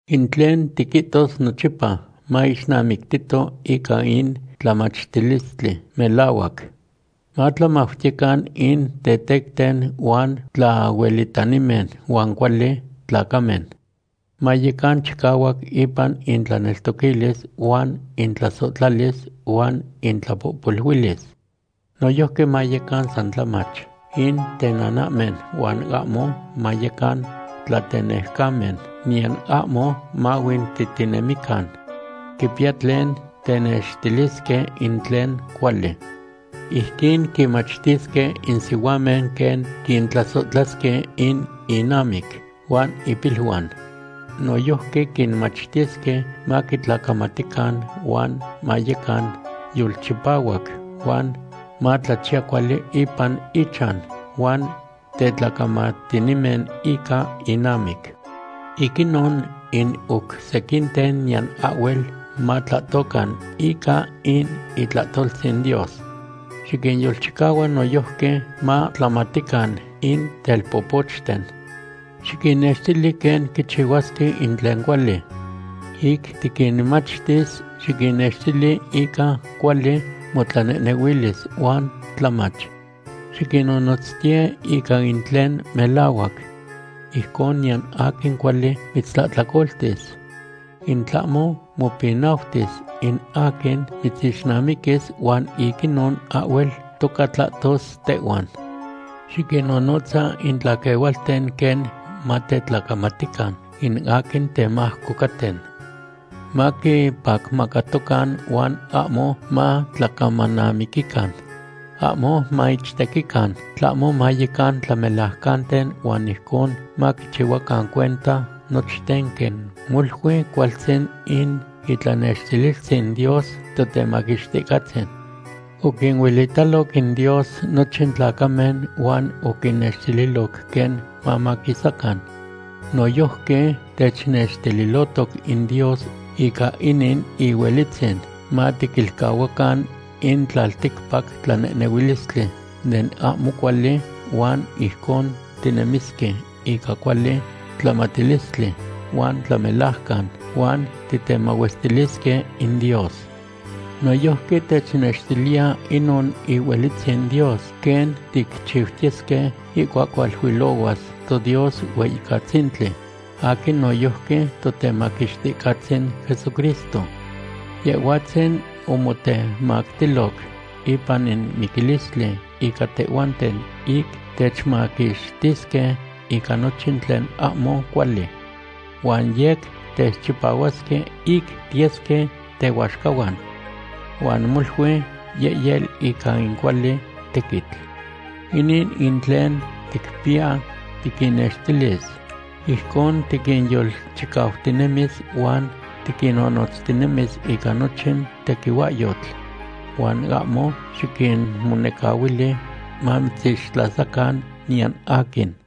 In tlen tiquihtos nochipa maixnamictito ica in tlamachtilistli melahuac. Matlamautiyecan in tetecten huan tlahuelitanimen huan cuali tlacamen. Mayecan chicahuac ipan intlaneltoquilis huan intlasohtlalis huan intlapohpoluilis. Noyojqui mayecan san tlamach in tenanahmen huan ahmo mayecan tlatenejcamen niyan ahmo mahuintihtinemican. Quipiya tlen tenextilisque in tlen cuali. Ijquin quinmachtisque in sihuamen quen quintlasohtlasque in innamic huan impiluan. Noyojqui quinmachtisque maquintlacamatican huan mayecan yolchipahuac huan matlachiya cuali ipan inchan huan tetlacamatinimen ica innamic. Ic inon in oc sequinten niyan ahhuel matlahtocan ica in itlahtoltzin Dios. Xiquinyolchicahua noyojqui matlamatican in telpopochten. Xiquinnextili quen quichihuasque in tlen cuali. Ic tiquinmachtis, xiquinnextili ica cuali motlanehnehuilis huan tlamach. Xiquinnonotztiye ica tlen melahuac. Ijcon niyan aquin cuali mitztlahtlacoltis. In tlahmo mopinautis in aquin mitzixnamiquis huan ic inon ahhuel toca tlahtos tehhuan. Xiquinnonotza in tlaquehualten quen matetlacamatican in aquin temajco caten. Maquipacmacatocan huan ahmo matlacamanamiquican. Ahmo maichtequican, tlahmo mayecan tlamelajcanten huan ijcon maquichihuacan cuenta nochten quen molui cualtzin in itlanextililtzin Dios Totemaquixticahtzin. Oquinuelitaloc in Dios nochin tlacamen huan oquinnextililoc quen mamaquisacan. Noyojqui technextililohtoc in Dios ica inin ihuelitzin matiquilcahuacan in tlalticpac tlanehnehuilistli den ahmo cuali huan ijcon tinemisque ica cuali tlamatilistli, huan tlamelajcan, huan titemahuestilisque in Dios. Noyojqui technextiliya inon ihuelitzin Dios quen ticchixtiyesque ihcuac hualuilohuas toDios Hueyicatzintli aquin noyojqui Totemaquixticahtzin Jesucristo. Yehhuatzin omotemactiloc ipan in miquilistli ica tehhuanten ic techmaquixtisque ica nochin tlen ahmo cuali. Huan yec techchipahuasque ic tiyesque tehuaxcahuan, huan molui yehyel ica in cuali tequitl. Inin in tlen ticpiya tiquinnextilis, ijcon tiquinyolchicautinemis huan tiquinnonotztinemis ica nochin tequihuahyotl. Huan ahmo xiquinmonecahuili mamitzixtlasacan niyan aquin.